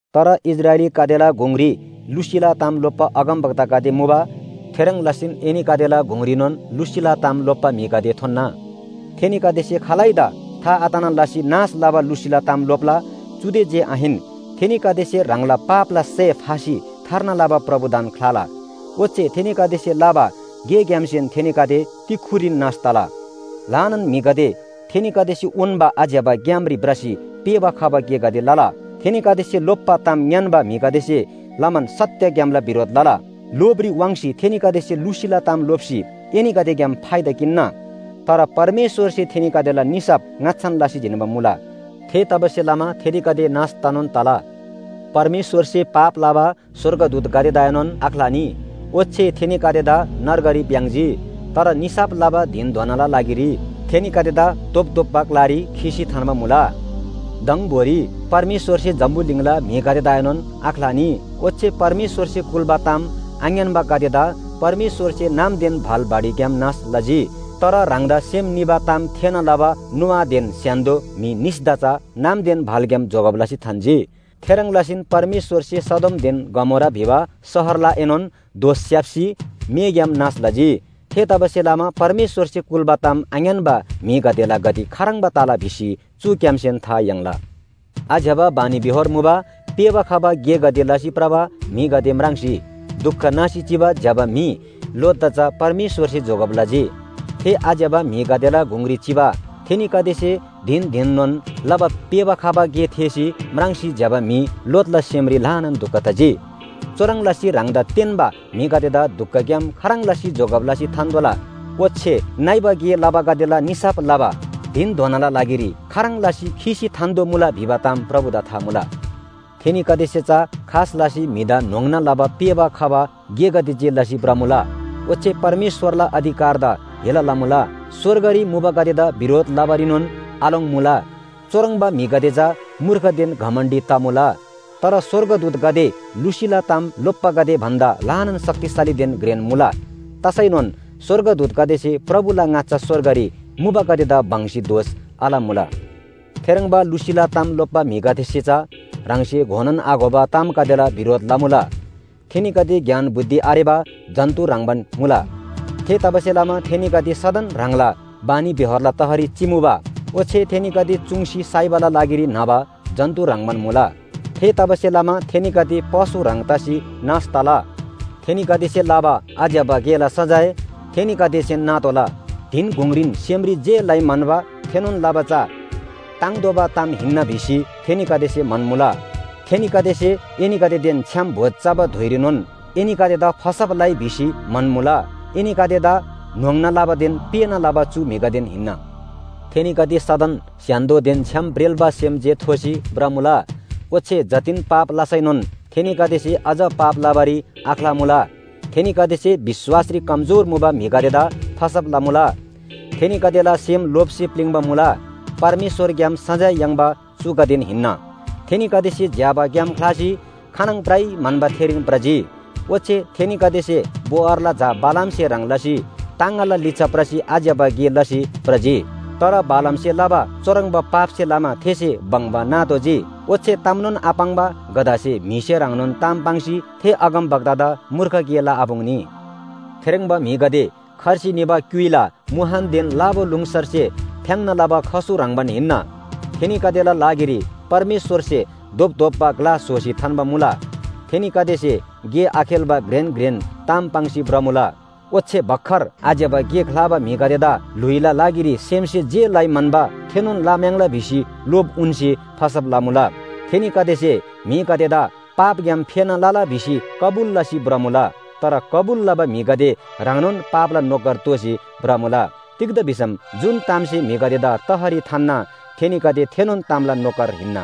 तर इस्राएलीगदेला गुङरी लुसीला ताम लोप्‍बा अगमवक्तागदे मुबा। थेह्रङ् लसीन एनीगदेला गुङरीनोन लुसीला ताम लोप्‍बा म्‍हिगदे थोन्‍ना। थेनीगदेसे खालैदा था आतना लसी नाश लबा लुसीला ताम लोप्‍ला। चुदे जे आहिन, थेनीगदेसे ह्राङला पापला सय फासी थार्ना लबा प्रभुदान ख्‍लाला। ओच्‍छे थेनीगदेसे लबा गेग्‍यामसेन थेनीगदे तिक्‍खुरीन नाश तला। ल्‍हानान म्‍हिगदे थेनीगदेसे उन्‍बा आज्‍यबा ग्‍यामरी भ्रसी पेःबा खबा गेगदे लला। थेनीगदेसे लोप्‍बा ताम ङ्‌यान्‍बा म्‍हिगदेसे लमान सत्‍य ग्‍यामला बिरोध लला। लोभरी वाङ्सी थेनीगदेसे लुसीला ताम लोप्‍सी एनीगदेग्‍याम फाइदा किन्‍ना। तर परमेश्‍वरसे थेनीगदेला निसाफ ङाच्‍छान लसी जिन्‍बा मुला। थेतबासेलमा थेनीगदे नाश तनोन तला। परमेश्‍वरसे पाप लबा स्‍वर्गदूतगदेदाएनोन आख्‍लानी। ओच्‍छे थेनीगदेदा नर्गरी भ्‍याङ्‍जी। तर निसाफ लबा धिनधोनाला लागिरी थेनीगदेदा धोपधोप्‍बा ग्‍लारी खीसी थान्‍बा मुला। दङबोरी परमेश्‍वरसे जम्‍बुलिङला म्‍हिगदेदाएनोन आख्‍लानी। ओच्‍छे परमेश्‍वरसे कुल्‍बा ताम आङ्‌यान्‍बागदेदा परमेश्‍वरसे नामदेन भाल बाढीग्‍याम नाश लजी। तर ह्राङदा सेम निबा ताम थेःना लबा नोआदेन स्‍य्‍हान्‍दो म्‍हि निसदा चा नामदेन भालग्‍याम जोगब लसी थान्‍जी। थेह्रङ् लसीन परमेश्‍वरसे सदोमदेन गमोरा भिबा शहरलाएनोन दोष स्‍याप्‍सी मेग्‍याम नाश लजी। थेतबासेलमा परमेश्‍वरसे कुल्‍बा ताम आङ्‌यान्‍बा म्‍हिगदेला गति खाह्रङ्बा तला भिसी चुग्‍यामसेन था याङ्ला। आज्‍यबा बानीबेहोर मुबा पेःबा खबा गेगदे लसी भ्रबा म्‍हिगदे म्राङ्सी दुख नासी चिबा ज्‍यबा म्‍हि लोतदा चा परमेश्‍वरसे जोगब लजी। थे आज्‍यबा म्‍हिगदेला गुङरी चिमा थेनीगदेसे धिन धिननोन लबा पेःबा खबा गे थेःसी, म्राङ्सी ज्‍यबा म्‍हि लोतला सेमरी ल्‍हानान दुख तजी। चुह्रङ् लसी ह्राङदा तेन्‍बा म्‍हिगदेदा दुखग्‍याम खाह्रङ् लसी जोगब लसी थान्‍तोःला। ओच्‍छे नइबा गे लबागदेला निसाफ लबा धिनधोनाला लागिरी खाह्रङ् लसी खीसी थान्‍तोःमुला भिबा ताम प्रभुदा था मुला। थेनीगदेसे चा खास लसी म्‍हिदा न्‍होङ्ना लबा पेःबा खबा गेगदे जे लसी भ्रमुला। ओच्‍छे परमेश्‍वरला अधिकारदा हेला लमुला। स्‍वर्गरी मुबागदेदा बिरोध लबारीनोन आलोङ्मुला। चुह्रङ्बा म्‍हिगदे चा मूर्खदेन घमण्‍डी तमुला। तर स्‍वर्गदूतगदे लुसीला ताम लोप्‍बागदे भन्‍दा ल्‍हानान शक्तिशालीदेन घ्रेन मुला। तसैनोन स्‍वर्गदूतगदेसे प्रभुला ङाच्‍छा स्‍वर्गरी मुबागदेदा बङ्‌सी दोष आलमुला। थेह्रङ्बा लुसीला ताम लोप्‍बा म्‍हिगदेसे चा ह्राङसे घोनोन आघोबा तामगदेला बिरोध लमुला। थेनीगदे ज्ञान बुद्धि आरेबा जन्‍तु ह्रङ्‌बान मुला। थेतबासेलमा थेनीगदे सदन ह्राङला बानीबेहोरला तहरी चिमुबा। ओच्‍छे थेनीगदे चुङ्सी साइबाला लागिरी न्‍हबा जन्‍तु ह्रङ्‌बान मुला। थेतबासेलमा थेनीगदे पशु ह्रङ् तसी नाश तला। थेनीगदेसे लबा आज्‍यबा गेला सजाय थेनीगदेसेन नातोःला। धिनगुङ्‌रीन सेमरी जे लइ म्‍हन्‍बा थेनोन लबा चा ताङ्तोःबा ताम हिन्‍ना भिसी थेनीगदेसे म्‍हन्‍मुला। थेनीगदेसे एनीगदेदेन छ्‌याम भोज चबा धुइरीनोन एनीगदेदा फसब लइ भिसी म्‍हन्‍मुला। एनीगदेदा न्‍होङ्ना लबादेन पेःना लबा चु म्‍हिगदेन हिन्‍ना। थेनीगदे सदन स्‍य्‍हान्‍दोदेन छ्‌याम ब्रेल्‍बा सेम जे थोसी भ्रमुला, ओच्‍छे जतिन पाप लसैनोन थेनीगदेसे अझ पाप लबारी आख्‍लामुला। थेनीगदेसे विश्‍वासरी कमजोर मुबा म्‍हिगदेदा फसब लमुला। थेनीगदेला सेम लोभसे प्‍लिङ्बा मुला। परमेश्‍वरग्‍याम सजाय याङ्बा चुगदेन हिन्‍ना। थेनीगदेसे ज्‍यबा ग्‍याम ख्‍लासी खानङ भ्रइ म्‍हन्‍बा थेरीन भ्रजी। ओच्‍छे थेनीगदेसे बओरला झा बालामसे ह्रङ् लसी टाङगाला लिच्‍छा भ्रसी आज्‍यबा गे लसी भ्रजी। तर बालामसे लबा चुह्रङ्बा पापसे लमा थेसे बङ्बा नातोःजी। ओच्‍छे तामनोन आपाङ्बा गधासे म्‍हिसे ह्रङ्नोन ताम पाङ्सी थे अगमवक्तादा मूर्ख गे लआपुङ्नी। थेह्रङ्बा म्‍हिगदे खर्सी निबा क्‍युइला मुहानदेन लाबालुङसरसे फ्‍याङ्ना लबा खसु ह्रङ्‌बान हिन्‍ना। थेनीगदेला लागिरी परमेश्‍वरसे धोपधोप्‍बा ग्‍ला स्‍होसी थान्‍बा मुला। थेनीगदेसे गे आखेल्‍बा घ्रेन घ्रेन ताम पाङ्सी भ्रमुला। ओच्‍छे भर्खर आज्‍यबा गे ख्‍लाबा म्‍हिगदेदा ल्‍हुइला लागिरी सेमसे जे लइ म्‍हन्‍बा थेनोन लम्‍याङ्ला भिसी लोभ उन्‍सी फसब लमुला। थेनीगदेसे म्‍हिगदेदा पापग्‍याम फेना लला भिसी कबुल लसी भ्रमुला। तर कबुल लबा म्‍हिगदे ह्राङनोन पापला नोकर दोःसी भ्रमुला। तिग्‍दा भिसम जुन तामसे म्‍हिगदेदा तहरी थान्‍ना थेनीगदे थेनोन तामला नोकर हिन्‍ना।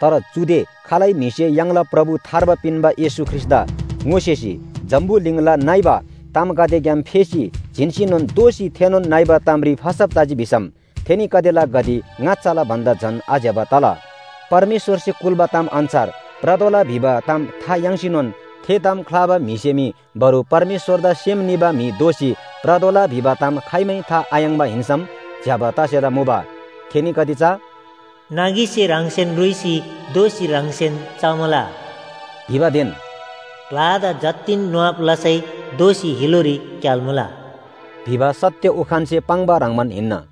तर चुदे खालै म्‍हिसे य्‍हाङला प्रभु थार्बा पिन्‍बा येशू ख्रीष्‍टदा ङोसेसी जम्‍बुलिङला नइबा तामगदेग्‍याम फेसी जिन्‍सीनोन दोःसी थेनोन नइबा तामरी फसब तजी भिसम थेनीगदेला गति ङाच्‍छाला भन्‍दा झन आज्‍यबा तला। परमेश्‍वरसे कुल्‍बा ताम अन्‍छार भ्रतोःला भिबा ताम था याङ्सीनोन थे ताम ख्‍लाबा म्‍हिसे मी बरु परमेश्‍वरदा सेम निबा म्‍हि दोःसी भ्रतोःला भिबा ताम खाइमै था आयाङ्बा हिन्‍सम ज्‍यबा तसेला मुबा। थेनीगदे चा “नगीसे ह्राङसेन रुइसी दोःसी ह्राङसेन चमुला” भिबादेन “ढ्‍वादा जतिन नुहाब लसै दोःसी हिलोरी क्‍याल्‍मुला” भिबा सत्‍य उखानसे पाङ्बा ह्रङ्‌बान हिन्‍ना।